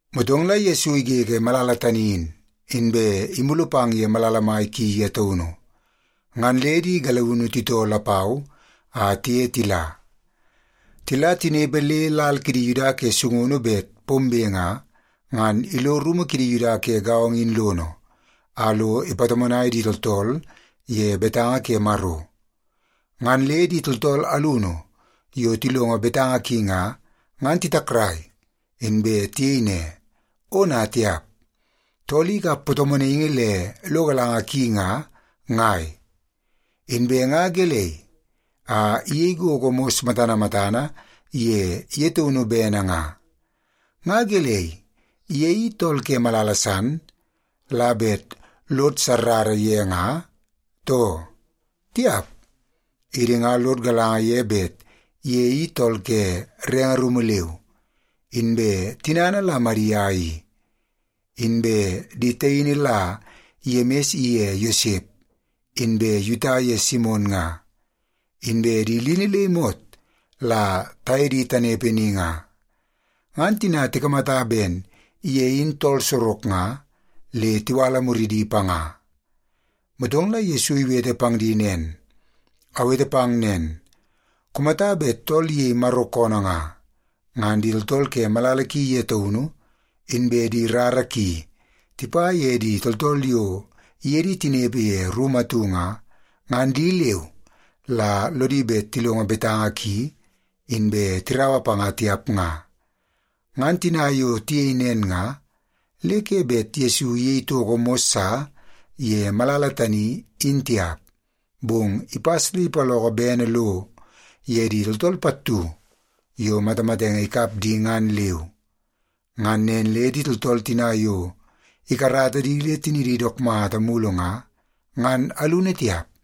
Motong la Yesu igege malala tani in, inbe imulu pang ye malala mai ki ye taunu. Ngan le di galiunu titoo lapau a tiye tila. Tila tinepe le lal kidi Yuda ke sungunu bet pombe nga, ngan ilo rumu kidi Yuda ke gaongo in lono a lo ipatomonai di tooltool ye betanga ke Maro. Ngan le di tooltool alunu yo tilongo betanga ki nga, ngan titakrai, inbe tiyei ne, “Ona tiap! Tool i ikap patomonaingi le lo galanga ki nga, ngai? Inbe nga gelei a iyei gogo mos matana matana ye ye taunu bene nga? Nga gelei, ye i tool ke malala san la bet lod sarara ye nga, too? Tiap! Idi nga lod galanga ye bet ye i tool ke renge rumu leu, inbe tinana la Madia i. Inbe di taini la Yemis ye Yosep, inbe Yuta ye Simon nga, inbe di lini le imot la taye di tanepe ni nga.” Ngan tina tikamata ben ye in tool sorok nga, le tiwala muridi panga. Motong la Yesu iwete pang di nen, “Awete pang nen, kumata bet tool iyei Maro koonoo nga, ngan di tooltool ke malala ki ye taunu, inbe di rara ki tipa ye di tooltool yo iye di tinepe ye rumu atu nga, ngan di leu la lodi bet tilongo betanga ki inbe tiraua panga tiap nga.” Ngan tina yo tiyei nen nga, le ke bet Yesu iyei toko mos sa ye malala tani, in tiap. Bong ipas le ipaloko bene lo ye di tooltool pattu yo matamatenge ikap di ngan leu. Ngan nen le di tooltool tina yo ikarata di le tinidi dook mata mulu nga, ngan alunu tiap.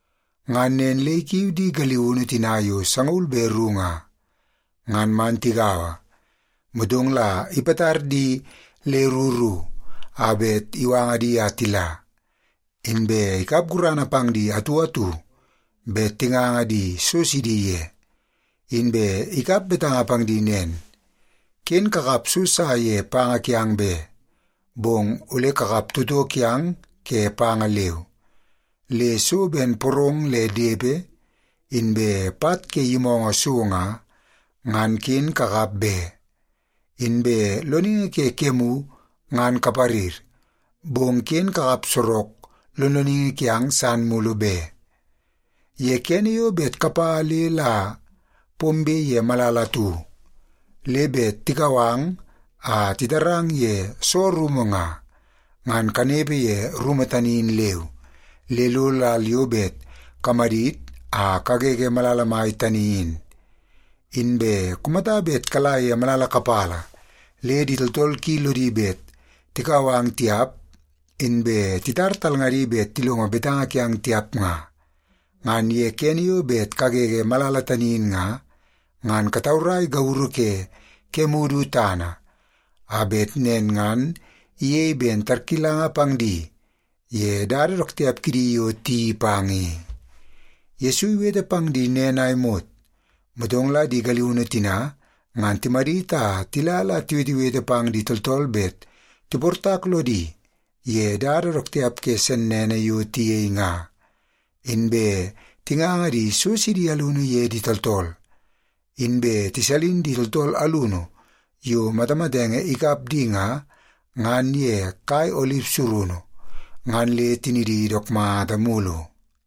Ngan nen le ikiu di galiunu tina yo sangaul be ru nga, ngan man tigaua. Motong la ipatar di le ru ru a bet iwanga di a tila, inbe ikap gurana pang di atu atu bet tinganga di so sidi ye. Inbe ikap betanga pang di nen, “Ken kakap so sa ye panga kiang be, bong ole kakap toto kiang ke panga leu. Le so ben porong le depe, inbe pat ke yimoongoo so nga, ngan ken kakap be. Inbe loningi ke kemu ngan kaparir, bong ken kakap sorok lonloningi kiang san mulu be. Ye kene yo bet kapa le la pombe ye malala atu, le bet tikau ang a titarang ye soo rumu nga, ngan kanepe ye rumu tani in leu, le lo lal yo bet kamadit a kagege malala mai tani in. Inbe kumata bet kala ye malala kapala le di tooltool ki lodi bet tikau ang tiap, inbe titar talngadi bet tilongo betanga kiang tiap nga, ngan ye kene yo bet kagege malala tani in nga, ngan kataurai gauru ke kemu du tana, a bet nen ngan iyei ben tarkilanga pang di ye dada dook tiap kidi yo tiyeii pang i.” Yesu iwete pang di nen a imot, motong la di galiunu tina ngan timadit a tila la tiwetewete pang di tooltool bet tiportak lodi ye dada dook tiap ke sennene yo tiyei nga. Inbe tinganga di so sidi alunu ye di tooltool. Inbe tisalin di tooltool alunu yo matamatenge ikap di nga, ngan ye kai olip surunu, ngan le tinidi dook mata mulu.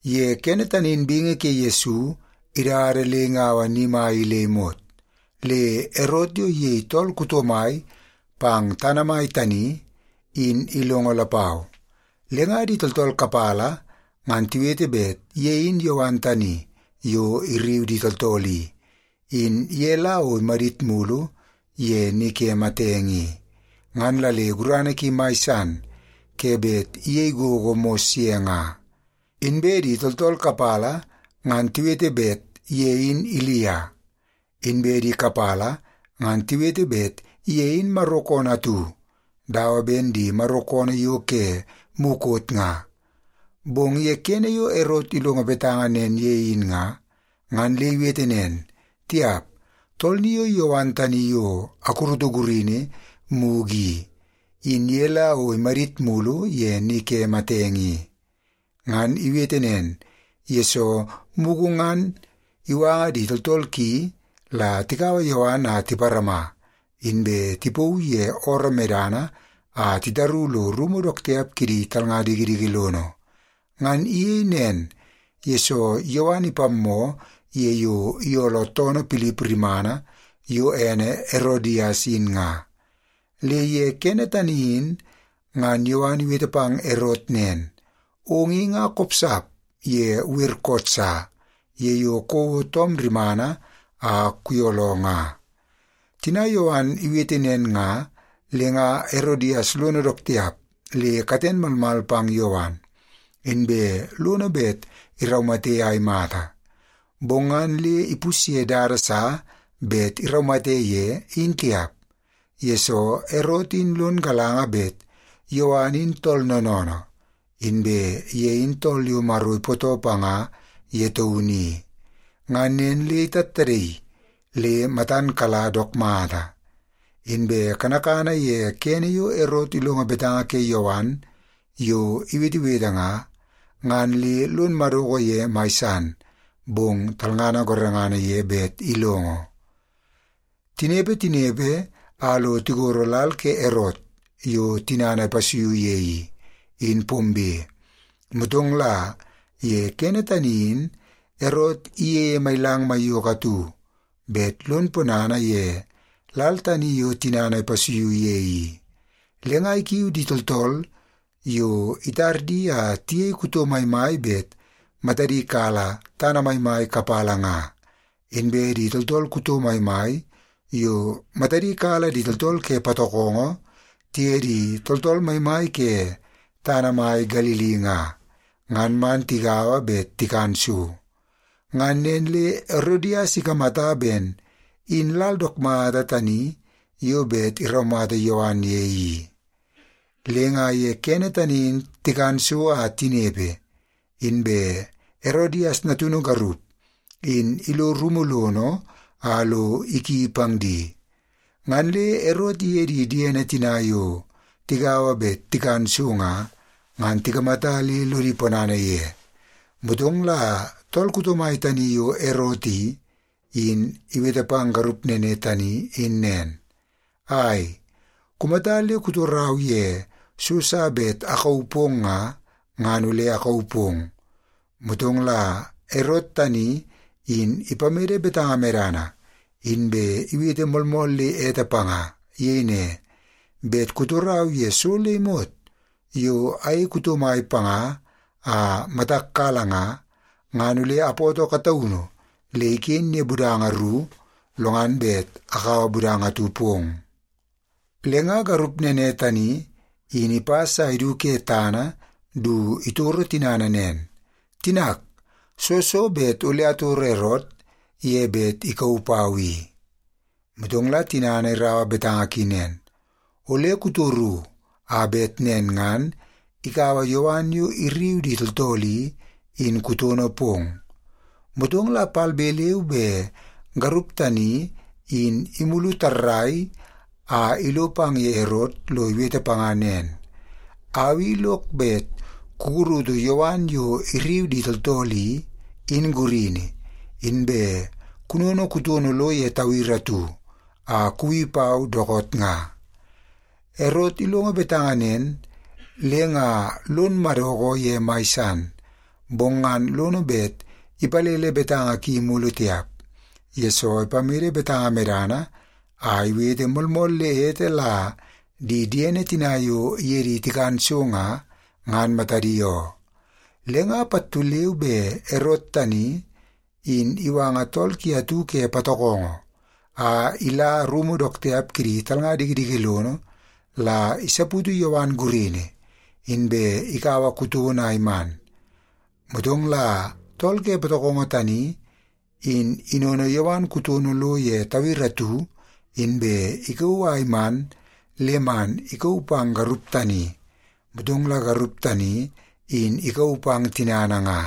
Ye kene tani in bingi ke Yesu idada le ingaua ni mai i le imot, le Erot yo iyei tool kuto mai pang tana mai tani, in ilongo lapau. Le nga di tooltool kapala ngan tiwete bet ye in Yowan tani yo irriu di tooltool i, in ye la o imadit mulu ye ni ke matenge i, ngan la le gurana ki mai san ke bet iyei gogo mos ye nga. Inbe di tooltool kapala ngan tiwete bet ye in Ilia. Inbe di kapala ngan tiwete bet ye in Maro koonoo atu dawa ben di Maro koonoo yo ke mukot nga. Bong ye kene yo Erot ilongo betanga nen ye in nga, ngan le iwete nen, “Tiap, tool ni o Yowan tani yo akurutu gurini mugu i, in ye la o imadit mulu ye ni ke matenge i.” Ngan iwete nen, yesoo mugu ngan iwanga di tooltool ki la tikaua Yowan a tiparama, inbe tipauu ye ooroo medana a titaru lo rumu dook tiap kidi talnga dikidiki lono. Ngan iyei nen, yesoo Yowan ipammoo ye yo iyooloo toonoo Pilip rimana yo ene Erodias in nga. Le ye kene tani in ngan Yowan iwete pang Erot nen, “Ong i nga kopsap ye wer koot sa ye yo kouo toom rimana a kuyooloo nga.” Tina Yowan iwete nen nga, le nga Erodias lono dook tiap le katen malmal pang Yowan, inbe lono bet iraumate a imata. Bong ngan le ipusye dada sa bet iraumate ye, in tiap, yesoo Erot in lon galanga bet Yowan in tool noonoonoo, inbe ye in tool yo Maro ipootoo panga ye taunu i. Ngan nen le itattadaii le matan kala dook mata. Inbe kanakana ye kene yo Erot ilongo betanga ke Yowan yo iwetewete nga, ngan le lon madoko ye mai san, bong talngana gorengana ye bet ilongo. Tinepe, tinepe, a lo tigoro lal ke Erot yo tinana ipasuiu ye i, in pombe. Motong la ye kene tani in Erot iyeie mailang maiyoko atu bet lon ponana ye lal tani yo tinana ipasuiu ye i. Le nga ikiu di tooltool yo itar di a tiyei kuto maimai bet matadi kala tana maimai kapala nga, inbe di tooltool kuto maimai yo matadi kala di tooltool ke patokongo tiye di tooltool maimai ke tana mai Galili nga, ngan man tigaua bet tikan so. Ngan nen le Erodias ikamata ben in lal dook mata tani yo bet iraumata Yowan ye i. Le nga ye kene tani in tikan so a tinepe, inbe Erodias natunu garup in ilo rumu lono a lo iki pang di. Ngan le Erot iye di diene tina yo tigaua bet tikan so nga, ngan tikamata le lodi ponana ye. Motong la tool kuto mai tani yo Erot i, in iwete pang garup nene tani in nen, “Ai, kumata le kutorau ye so sa bet akauu pong nga, ngan ole akauu pong.” Motong la Erot tani in ipamede betanga medana, inbe iwete moolmool le ete panga. Iyei ne, “Bet kutorau ye so le imot yo ayei kuto mai panga a matak kala nga, ngan ole apoto kataunu le iken ye budanga ru, lo ngan bet akaua budanga atu pong.” Le nga garup nene tani in ipas a idu ke tana du itoro tinana nen, “Tinak, soo so bet ole atoro Erot ye bet ikauu pau i?” Motong la tinana iraua betanga ki nen, “Ole kutoru a bet nen ngan ikaua Yowan yo irriu di tooltool i, in kutono pong.” Motong la palbe leu be garup tani in imulu tarrai a ilo pang ye Erot lo iwete panga nen, “Au i lok bet kukurutu Yowan yo irriu di tooltool i, in gurini, inbe kunono kutono lo ye tawiri atu a kuwi pau dookoot nga.” Erot ilongo betanga nen le nga lon madoko ye mai san. Bong ngan lono bet ipalele betanga ki mulu tiap, yesoo ipamede betanga medana a iwete moolmool le ete la di diene tina yo iye di tikan so nga, ngan matadi oo. Le nga pattu leu be Erot tani, in iwanga tool ki atu ke patokongo a ila rumu dook tiap kidi talnga dikidiki lono la isaputu Yowan gurini, inbe ikaua kutono a iman. Motong la tool ke patokongo tani in inono Yowan kutono lo ye tawiri atu, inbe ikauu a iman le man ikauu pang garup tani. Motong la garup tani in ikauu pang tinana nga.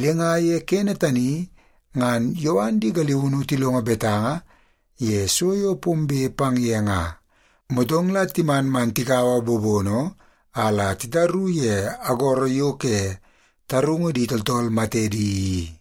Le nga ye kene tani ngan Yowan di galiunu tilongo betanga ye so yo pombe pang ye nga, motong la timan man tikaua bobono a la titaru ye agoro yo ke tarungu di tooltool matedi i.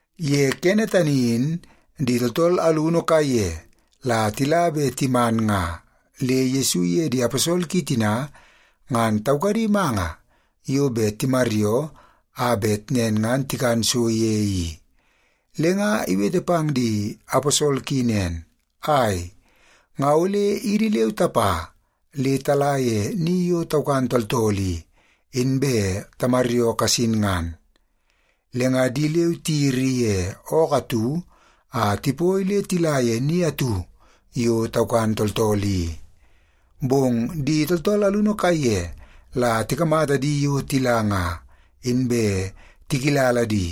Ye kene tani in di tooltool alunu kaiye la tila be timan nga le Yesu iye di aposol ki tina ngan taukadi manga yo bet timaryoo a bet nen ngan tikan so ye i. Le nga iwete pang di aposol ki nen, “Ai, nga ole idi leu tapa le tala ye ni yo taukan tooltool i, inbe tamaryoo kasin ngan.” Le nga di leu tiyiri ye ookoo atu a tipoi le tila ye ni atu yo taukan tooltool i. Bong di tooltool alunu kaiye la tikamata di yo tila nga, inbe tikilala di.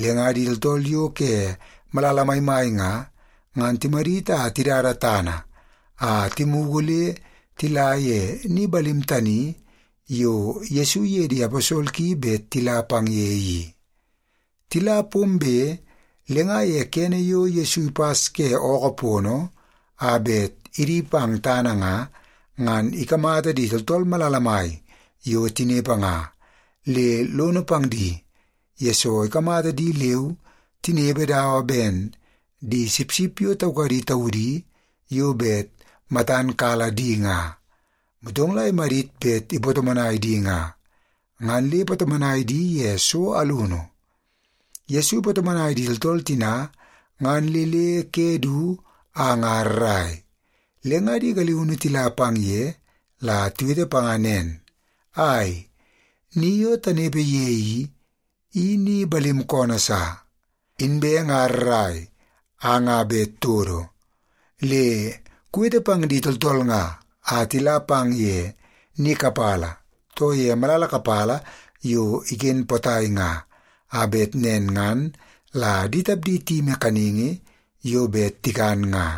Le nga di tooltool yo ke malala maimai nga, ngan timadit a tidada tana a timugu le tila ye ni balim tani yo Yesu iye di aposol ki bet tila pang ye i. Tila pombe, le nga ye kene yo Yesu ipas ke ookoo pono a bet idi pang tana nga, ngan ikamata di tooltool malala mai yo tinepe nga, le lono pang di, yesoo ikamata di leu tinepe dawa ben di sipsip yo taukadi taudi yo bet matan kala di nga. Motong la imadit bet ipatomonai di nga, ngan le ipatomonai di ye so alunu. Yesu ipatomonai di tooltool tina ngan le le ke du a nga rrai. Le nga di galiunu tila pang ye la tiwete panga nen, “Ai, ni yo tanepe ye i, i ni balim koonoo sa, inbe nga rrai a nga bet todo. Le kuwete pang di tooltool nga a tila pang ye ni kapala, too ye malala kapala yo iken potai nga, a bet nen ngan la di tapdi tiyimi kaningi yo bet tikan nga.”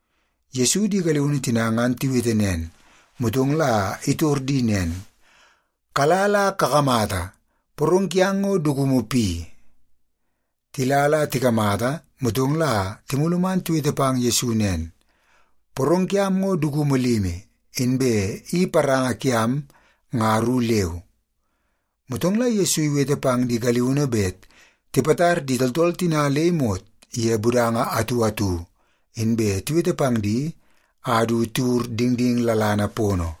Yesu di galiunu tina ngan tiwete nen, motong la itor di nen, “Kala la kakamata, porong kiang ngo dukumu pi?” Tila la tikamata, motong la timulu man tiwete pang Yesu nen, “Porong kiam ngo dukumu limi, inbe i paranga kiam nga ru leu.” Motong la Yesu iwete pang di galiunu bet tipatar di tooltool tina le imot ye budanga atu atu, inbe tiwete pang di a du tiwur dingding lalana pono.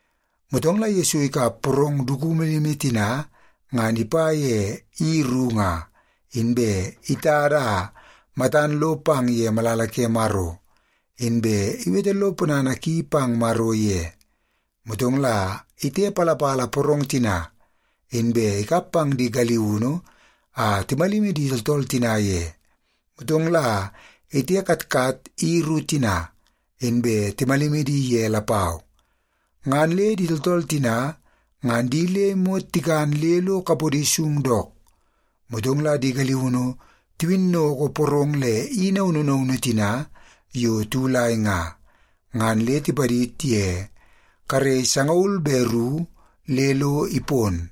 Motong la Yesu ikap porong dukumu limi tina ngan ipa ye i ru nga, inbe itada a matan lo pang ye malala ke Maro, inbe iwete lo ponana ki pang Maro ye. Motong la itepalapala porong tina, inbe ikap pang di galiunu a timalimi di tooltool tina ye. Motong la itekatkat i ru tina, inbe timalimi di ye lapau. Ngan le di tooltool tina ngan di le imot tikan le lo kapodi sung dook. Motong la di galiunu tiwinnoko porong le i naunu naunu tina yo tiwulai nga, ngan le tipadid ye karei sangaul be ru le lo ipon.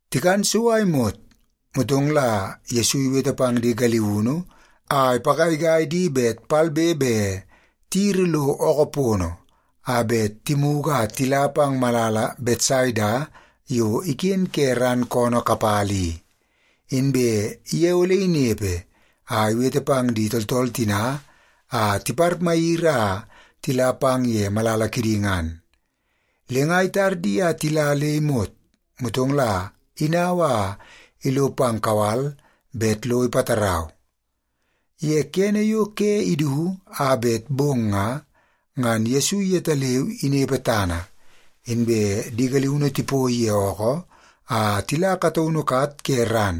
Tikan so a imot, motong la Yesu iwete pang di galiunu a ipagaigai di bet palbe be tiyiri lo ookoo pono a bet timugu a tila pang malala Betsaida yo iken ke ran koonoo kapala i. Inbe ye ole inepe a iwete pang di tooltool tina a tiparmayiri a tila pang ye malala kidi ngan. Le nga itar di a tila le imot, motong la inau a ilo pang kawal bet lo ipatarau. Ye kene yo ke idu a bet bong nga, ngan Yesu yetaleu inepe tana, inbe di galiunu tipoi ye ookoo a tila kataunu kat ke ran.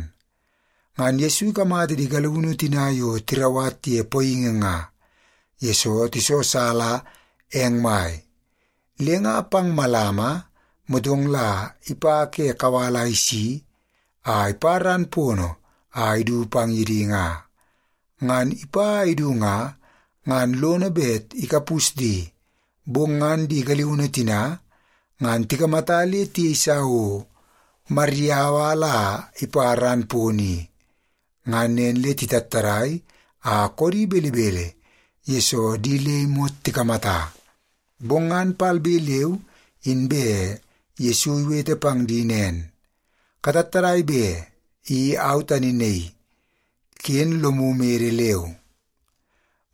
Ngan Yesu ikamata di galiunu tina yo tirauwat ye poingi nga, yesoo tisosala eng mai. Le nga pang malama, motong la ipa ke kawal a isi a ipa ran pono a idu pang ye di nga. Ngan ipa a idu nga, ngan lono bet ikapus di, bong ngan di galiunu tina ngan tikamata le tiyeisa o mariyaua la ipa ran pono i. Ngan nen le titattadai a koodi belebele, yesoo di le imot tikamata. Bong ngan palbe leu inbe Yesu iwete pang di nen, “Katattadai be! I au tani naii. Ken lomu mede leu.”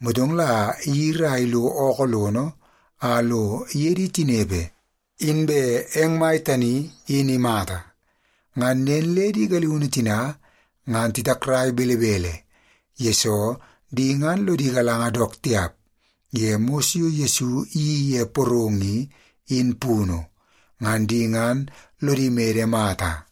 Motong la iyiri a ilo ookoo lono a lo iye di tinepe, inbe eng mai tani in imata. Ngan nen le di galiunu tina ngan titakrai belebele, yesoo di ngan lodi galanga dook tiap ye mos yo Yesu iyeii ye porong i, in punu. Ngan di ngan lodi mede mata.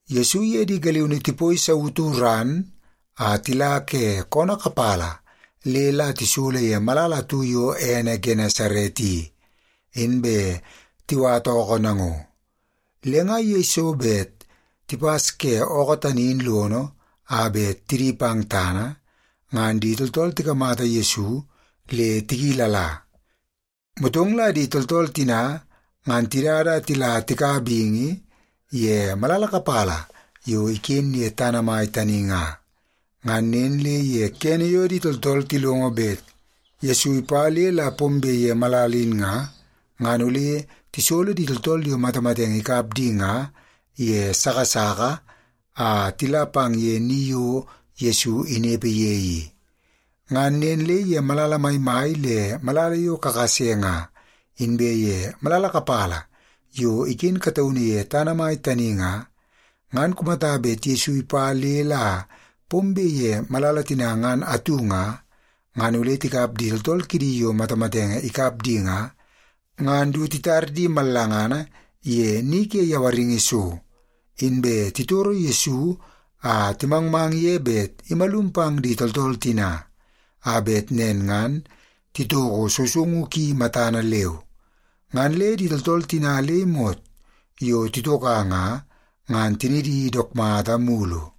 Yesu iye di galiunu tipoi sautu ran a tila ke koonoo kapala le la tisolo ye malala atu yo ene Genesaret i, inbe tiwata ookoo nango. Le nga yeiso bet tipas ke ookoo tani in lono a bet tidi pang tana, ngan di tooltool tikamata Yesu le tikilala. Motong la di tooltool tina ngan tidada a tila tika bingi ye malala kapala yo iken ye tana mai tani nga. Ngan nen le ye kene yo di tooltool tilongo bet Yesu ipa le la pombe ye malala in nga, ngan ole tisolo di tooltool yo matamatenge ikap di nga ye sasaka a tila pang ye ni yo Yesu inepe ye i. Ngan nen le ye malala maimai le malala yo kakase nga, inbe ye malala kapala yo iken kataunu ye tana mai tani nga, ngan kumata bet Yesu ipa le la pombe ye malala tina ngan atu nga, ngan ole tikap di tooltool kidi yo matamatenge ikap di nga, ngan du titar di mallangana ye ni ke yawaringi so. Inbe titoro Yesu a timangmang ye bet imalum pang di tooltool tina, a bet nen ngan titoko sousoungu ki matana leu. Ngan le di tooltool tina le imot yo titoka nga, ngan tinidi dook mata mulu.